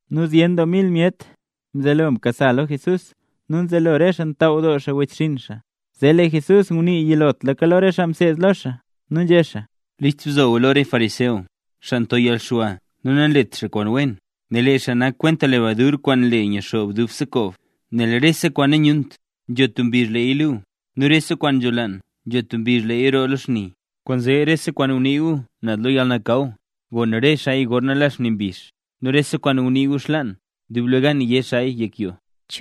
Nu zyen doo mil myet mzelo mkasa lo Jesús nu nzelo re xaa ntaaw doo xaa wechxinn xaa. Zee lee Jesús ngunii yilotlaka lo re xaa mseed lo xaa, nu nzhé xaa: —List bzo gu lo re fariseo, xaa nto yalxwa nu nanlet xaa kwaan wen, nel lee xaa nak kwenta lebadur kwaan nle nyixoob dubse koob. Nel rese kwaan nanyunt, nzho tub mbizh leeya luu, nu rese kwaan nzholaan nzho tub mbizh leeya roo lo xni. Kwaanzee rese kwaan ngunii gu naz lo yalnakaw, gon re xaaya gorna nla xni mbizh; nu rese kwaan ngunii gu xlaan, dublegan yé xaaya yek yoo.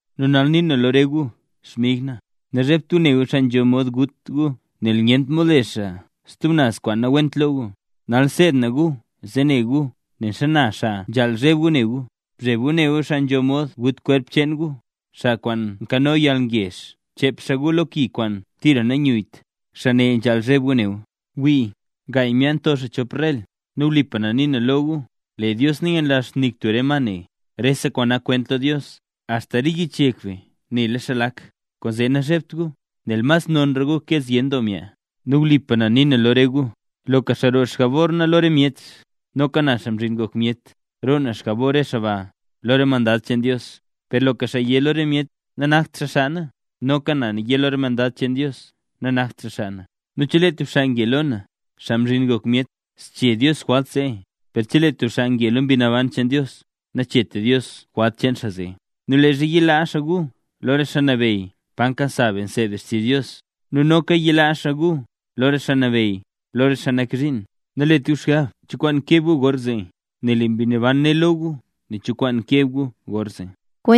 ’Nu nal nii na lo re gu, xmig na. Nazhebt gu ne gu xaa nzho mod gut gu nel nyentra mod le xaa stub naz kwaan nawent lo gu. Nal seed na gu zee ne gu nen xana xaa nzhaal zheb gu ne gu. Bzheb gu ne gu xaa nzho mod gut kwerp cheen gu, xaa nkano yalgezh chep xaa gu lo ki kwaan tira nanyuyyt. Xaa ne nzhaal zheb gu ne gu. ’Wii, gaay myaa nto xaa chopka rel. Nu wlipa na nii na lo gu, lee Dios nanyanlazht nik tub re ma ne. Rese kwaan nak kwent lo Dios, axta re yich yek be nela xaa lak. Kwaanzee nazhebt gu, nel mas nonra gu ke zyen doo myaa. ’Nu wlipa na nii na lo re gu, loka xaa roo xjabor na lo re myet, noka na Xaa Mzhin Ngok Myet, roo na xjabor re xaa ba lo re mandad cheen Dios, per loka xaa yé lo re myet nanakt xaa xaa na, noka na yé lo re mandad cheen Dios nanakt xaa xaa na. ’Nu chelee tub xaa nge lo na, Xaa Mzhin Ngok Myet, zchee Dios jwalt zee; per chelee tub xaa nge lo Mbi Naban cheen Dios, nacheet Dios jwalt cheen xaa zee. ’Nu leezha yilaa xaa gu lo re xaa nabeyy pa nkasa be nseed be xtizh Dios, nu noka yilaa xaa gu lo re xaa nabeyy nu lo re xaa nak zhiin, nalet gu xgab cho kwaan keb gu gorzee, nel lee Mbi Naban né lo gu nen cho kwaan keb gu gorzee.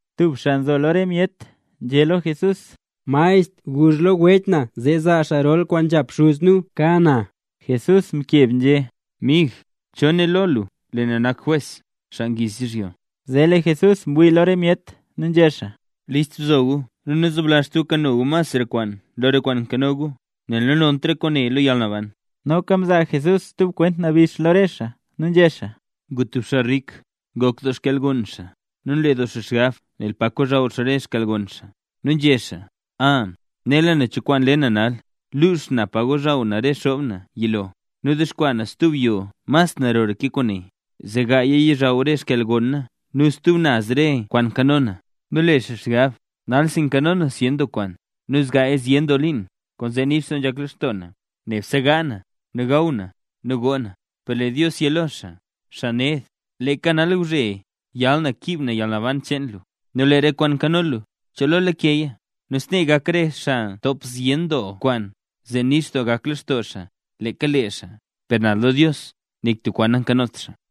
Tub xaa nzo lo re myet nzhé lo Jesús: —Maestr, guzh lo wech na zee zaa xaa rol kwaan nzhap xuz nu ka na. Jesús mkeb nzhé: —Mig, ¿cho né lo lu lee na nak jwes, xaa ngiiz yizhyo? Zee lee Jesús ngwii lo re myet nu nzhé xaa: —List bzo gu nu nazoblazht gu kano gu masra kwaan lo re kwaan nkanola gu; nel nanont re kwaane lo yalnaban. Noka mzaa Jesús stub kwent nabix lo re xaa nu nzhé xaa: —Ngu tub xaa rik ngok doo xkyalgon xaa, nu nle doo xaa xgab nel pa kochaw xaa re xkyalgon xaa. Nu nzhé xaa: “A, nela na cho kwaan le na nal. Lux na pa ngozhaw na re xob na yilo, nu dexkwaa na stub yoo mas narora ke kwaane. Zee gaaya yizhaw re xkyalgon na nu stub naz re kwaan nkano na.” Nu le xaa xgab: “Nalsi nkano na zyen doo kwaan, nu zgaaya zyen doo liin. Kwaanzee nix doo nzhak lextoo na; nebse gaa na, nu gaw na, nu goo na.” Per lee Dios yé lo xaa: “Xaa ned, leeka nalgwzhe yal na kiib na yalnaban cheen lu, nu lee re kwaan nkano lu, ¿cho lo lakeya?” Nu snee gak re xaa ntop zyen doo kwaan zee nebse nix doo gak lextoo leeka lee xaa, per naz lo Dios nik tub kwaan nankanot xaa.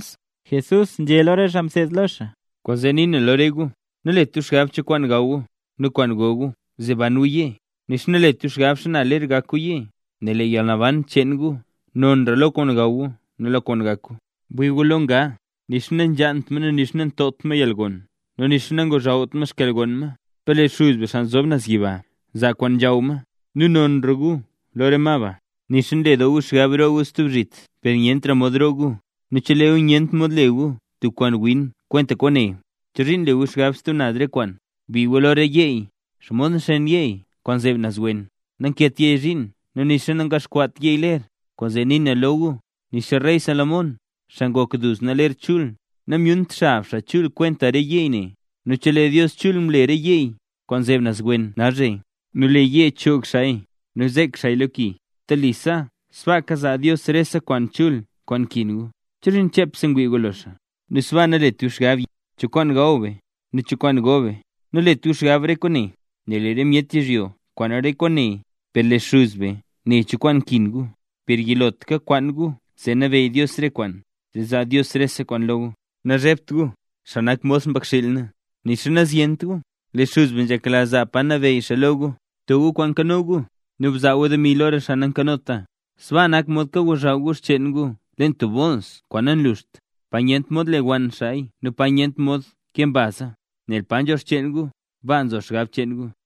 Jesús nzhé lo re xaa mseed lo xaa: —Kwaanzee nii na lo re gu: Nalet gu xgab kwaan gaw gu nu kwaan go gu zee ban gu yee, nixa nalet gu xgab xana ler gak gu yee, nel lee yalnaban cheen gu nonra lo kwaan gaw gu nu lo kwaan gak gu. Bwii gu lo nga. Nixa nanzhaant ma nu nixa nantopt ma yalgon nu nixa nangochawt ma xkyalgon ma, per lee Xuz be, xaa nzob naz leen yiba, nzaa kwaan nzhaw ma. Nu nonra gu lo re ma ba. Nixa nle doo gu xgab roo gu stub zhit per nyentra mod roo gu. Nu chelee gu nyent mod le gu tub kwaan win kwenta kwaane, ¿chozhiin nle gu xgab stub naz re kwaan? ’Bwii gu lo re yeey, xomod nxeen yeey kwaan nzeb naz wen. Nankeet yeey zhiin nu nixa nangaxkwaat yeey ler. Kwaanzee nii na lo gu, nixa rey Salomón, xaa ngok duzna ler chul, namyunt xab xaa chul kwenta re yeey ne. Nu chelee Dios chul mle re yeey kwaan nzeb naz wen nalzhe, nu lee yee choog xaaya nu zek xaaya lo ki, telisa sbaaka zaa Dios rese kwaan chul kwaan nkin gu. ¿Chozhiin chepse ngwii gu lo xaa? Nu sbaa nalet gu xgab, yé gu: “¿Cho kwaan gaw be, nu cho kwaan go be?” Nalet gu xgab re kwaane. Nel lee re myet yizhyo nkwaan re kwaane, per lee Xuz be nela cho kwaan nkin gu. Per yilotlaka kwaan gu zee nabeyy Dios rese kwaan, zee zaa Dios rese kwaane lo gu. ’Nazhebt gu, xaa nak mod xmbakxiil na, nixa nazyent gu, per lee Xuz be nzhekla zaa pa nabeyy xaa lo re gu. Bto gu kwaan nkano gu, nu bzaa gu demi lo re xaa nankanota, sbaa nak mod kagozhaw gu xcheen gu leen tub bools kwaan nanluxt, pa nyent mod lewann xaa gu nu pa nyent mod kee mbaza. Nel pa nzho re xcheen gu, baa nzo xgab cheen gu.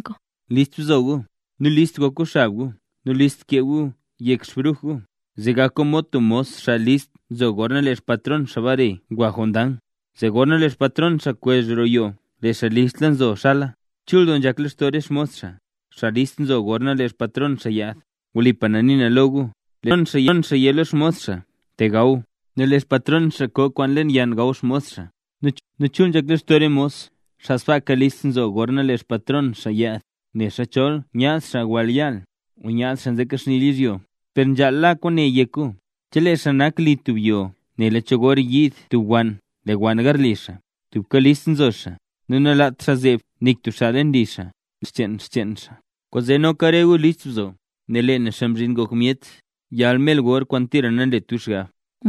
’List bzo gu, nu list gok gu xab gu nu list kee gu yek xbruj gu, zee gak gu mod tub mos xaa listla nzo gorna lee xpatron xaa mbare ngwa jondang, zee gorna lee xpatron xaa kwezh roo yoo lee xaa listlaka nzo xala. Chul doo nzhak lextoo re xmos xaa, xaa list nzo gorna lee xpatron xaa yaad. Wlipa na nii na lo gu, lee xpatron xaa yé lo xmos xaa: “Te gaw”. Nu lee xpatron xaa ko kwaan leen yann gaw xmos xaa. Nu chul nzhak lextoo re mos, xaa sbaaka listla nzo xaa gorna lee xpatron xaa yaad, nexa chol nyaad xaa wall yaal o nyaad xaa nzekaxnila yizhyo. Per nzhaal la kwaane yek gu: Chelee xaa nak li tub yoo nela cho gor yiid tub wann lewann garli xaa, tubka list nzo xaa, nu nalaat xaa zeeb nik tub xaa leen li xaa, lewann xcheen xaa. Kwaanzee noka re gu list bzo gu, nel lee na, Xaa Mzhin Ngok Myet, yal mer gor kwaan tira nanlet gu xgab.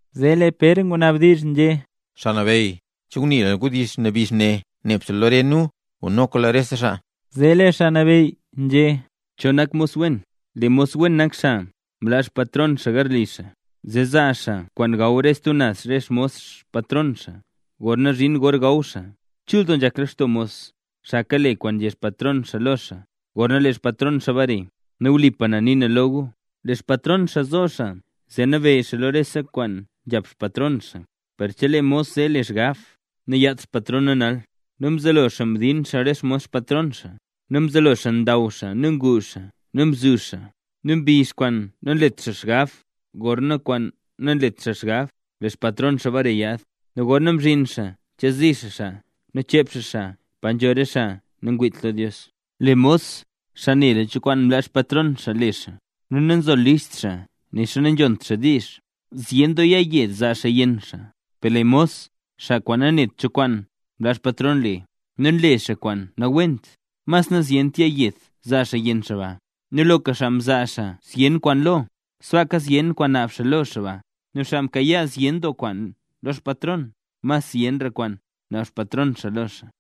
Zee lee Pér ngunabdizh nzhé: —Xaa Nabeyy, ¿che ngunii lu wdizh nabix ne nebse lo re nu o noka ngunii luya lo rese xaa? Zee lee Xaa Nabeyy nzhé: —¿Cho nak mos wen? Lee mos wen nak xaa mlaa xpatron xaa garli xaa, zee zaa xaa kwaan gaw re stub naz re xmos patron gorna zhin gor gaw xaa. Chul doo nzhak lextoo mos, xaa kale kwaan nzhé xpatron xaa lo xaa, gorna lee xpatron xaa bare. Nu wlipa na nii na lo gu, lee xpatron xaa zo xaa ne zee nabeyy xaa lo rese kwaan nzhap xpatron xaa. Per chelee mos zee le xgab: “Nayaadt xpatron na nal”, nu mzelo xaa mdin re xmos xpatron xaa, nu mzelo xaa ndaw xaa nu ngu xaa zee mzuzh xaa, nu mbizh kwaan nanlet xaa xgab nu gor kwaan nanlet xaa xgab, lee xpatron xaa bare yaad nu gorna zhin xaa chezi xaa xaa nu chep xaa xaa pa nzho re xaa nangwiit lo Dios. ’Lee mos, xaa nela cho kwaan mlaa xpatron xaa le xaa, nu nanzolist xaa nixa nanzhont xaa diizh, zyen doo yaayed zaa xaa yenn xaa. Per lee mos, xaa kwaan nanet cho kwaan mlaa xpatron le, nu nle xaa kwaan nawent, mas nazyent yaayed zaa xaa yenn xaa ba. Nu loka xaa mzaa xaa zyen kwaan lo, sbaaka zyen kwaan naab xaa lo xaa ba; nu xaa mkayaa zyen doo kwaan lo xpatron, mas zyenra kwaan naab xpatron xaa lo xaa.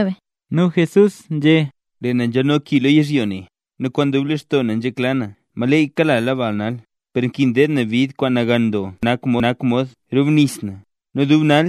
Nu Jesús nzhé: —Lee na nzhalno ki lo yizhyo ne; ¡nu kwaan dub lextoo na nzhekla na maleyy kala bal nal! ¡Per nkin deed na bid kwaan nagan doo kwaan nak mod rubnis na, nu dubse nal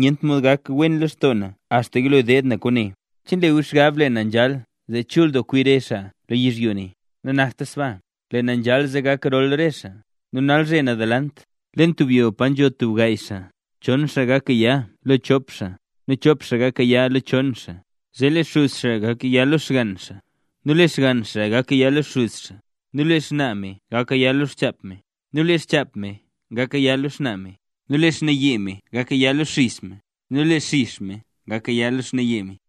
nyent mod gak wen lextoo na axta yilo deed na kwaane! ¿Che nle gu xgab lee na nzhal zee chul doo kwi re xaa lo yizhyo ne? Nanakta sbaa. Lee na nzhal zee gak rol re xaa. Nu nalzhe naz delant, leen tub yoo pa nzho tub gaay xaa, chon xaa gak gaya lo chop xaa nu chop xaa gak gaya lo chon xaa. Zee lee xuz xaa gak gaya lo xgann xaa, nu lee xgann xaa gak gaya lo xuz xaa, nu lee xnaa me gak gaya lo xchap me, nu lee xchap me gak gaya lo xnaa me. Lee xnaaye me gak gaya lo xix me, nu lee xix me gak gaya lo xnaaye me.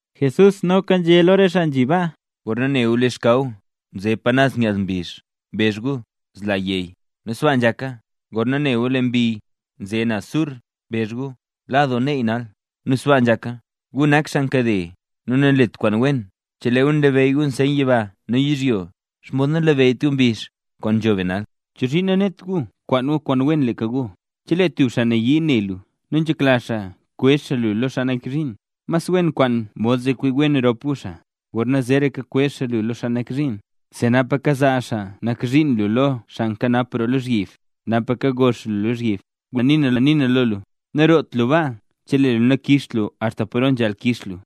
Jesús noka nzhé lo re xaa nzhi baa: —Gorna ne gu lee xkaw nze pa naz nyaaz mbizh, mbezh gu: “Zla yey”. Nu sbaa nzhaka. Gorna ne gu lee mbi nze naz sur, mbezh gu: “La doo neey nal”. Nu sbaa nzhaka. ¡Gu nak xaa nkade nu nanlet kwaan wen! Chelee gu nlabeyy gu re nseyn yiba nu yizhyo, ¿xomod nanlabeyyt gu re mbizh kwaan nzho be nal? ’¿Chozhiin nanet gu kwaan gu kwaan wen leeka lo gu? Chelee tub xaa nayii ne lu nu nzhekla xaa kwezh xaa lu lo xaa nak zhiin, mas wen kwaan mod zee kwi wen rop gu xaa, gorna zeeraka kwezh xaa lu lo xaa nak zhiin, zee napa kazaa xaa nak zhiin lu lo xaa nkanap roo lozhyib, napa kago xaa lu lozhyib. Wlipa na nii na lo lu, naroot lu baa chelee lu nakixt lu axta paro nzhaal kix lu.